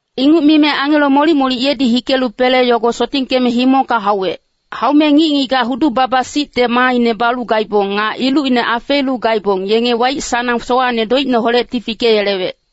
Inguc mime angelo molic-molic yedi hikelu pele yogo sotingkeme himongka hauwec. Haume ngic-ngigac hudu-baba-sicte maaine balu gaibong, nga ilucine afeelu gaibong, yenge waic-sanang sowacne doicineholecti fikeyelewec.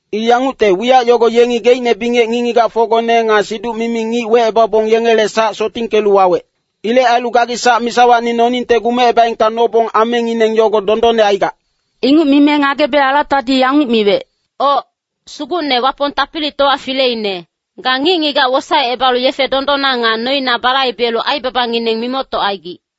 I yangucte, wiyac yogo yengi geicne bingec ngic-ngigacfocgone nga siduc-mimi ngic wecebabong yengele sac sotingkelu wawec. Ilec ailu gagi sac misawacni noningte gumecebaengka nobong amengineng yogo dondonne aigac.” Inguc mime ngagebe alatadi yanguc miwec, “Oc, Sugucne Wapong Tapilitowa Fileine, ga ngic-ngigac wosaecebalu yefe dondonna nga noina balaibelu aibabangineng mimoctocaigic.”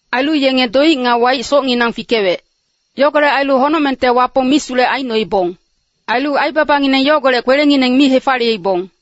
Ailu yenge doic nga waic socnginang fikewec. Yogolec ailu honocmengte Wapong misulec aicnoibong. Ailu aibabangineng yogolec kwelengineng mi hefaliyeibong.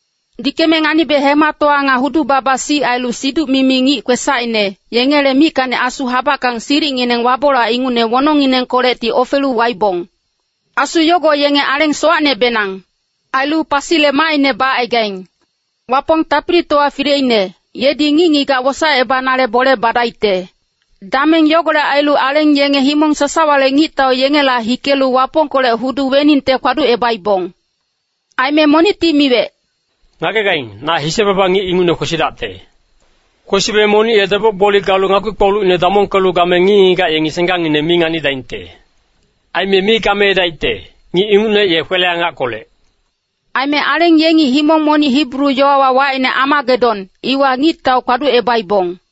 Dikeme nganibe hematowa nga hudu-baba-sic ailu siduc-mimi ngic kwesacine, yengele mickacni asu habackang silicngineng wabolac ingucne wonongnginengkolecti ofelu waibong. Asu yogo yenge aleng sowacnebenang. Ailu pasile maaine bacaigaing. Wapong Tapilitowa Fileine, yedi ngic-ngigac wosaecebanale bole badaicte. Dameng yogolec ailu aleng yenge himong sasawale ngictau yengela hikelu Wapongkolec hudu weningte kpaducebaibong. Aime monicti miwec, “Ngagegaing, na hise-baba ngic ingucne kwesidacte. Kwesibe monic ye deboc-gboli galu ngakpi-kpolucine damongkelu game ngic-ngigac yengi senggangngine mi nganidaingte. Aime mi gameedaicte, ngic ingucne ye kwele-angackolec.” Aime aleng yengi himong monic Hibru yowawa wacine Amagedon, iwa ngictau kpaducebaibong.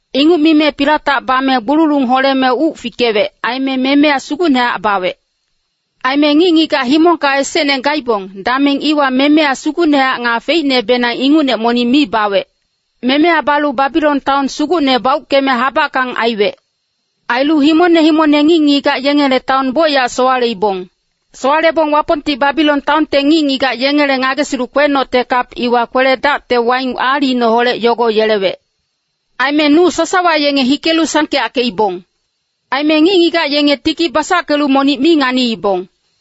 Inguc mime pilatac bame gbululung holeme uc fikewec, aime memeya sugucnehac bawec. Aime ngic-ngigac himongka esecne gaibong, dameng iwa memeya sugucnehac nga feicnebenang ingucne monic mi bawec. Memeya balu Babilon taon sugucne bauckeme habackang aiwec. Ailu himongne himongne ngic-ngigac yengele taon bocyac sowaleibong. Sowalebong Wapongti Babilon taonte ngic-ngigac yengele ngagesilu kwenocte kap iwa kwele-dacte waing aalicineholec yogo yelewec. Aime nuc sasawa yenge hikelu sangkeyackeibong. Aime ngic-ngigac yenge tiki basackelu monic mi nganiibong.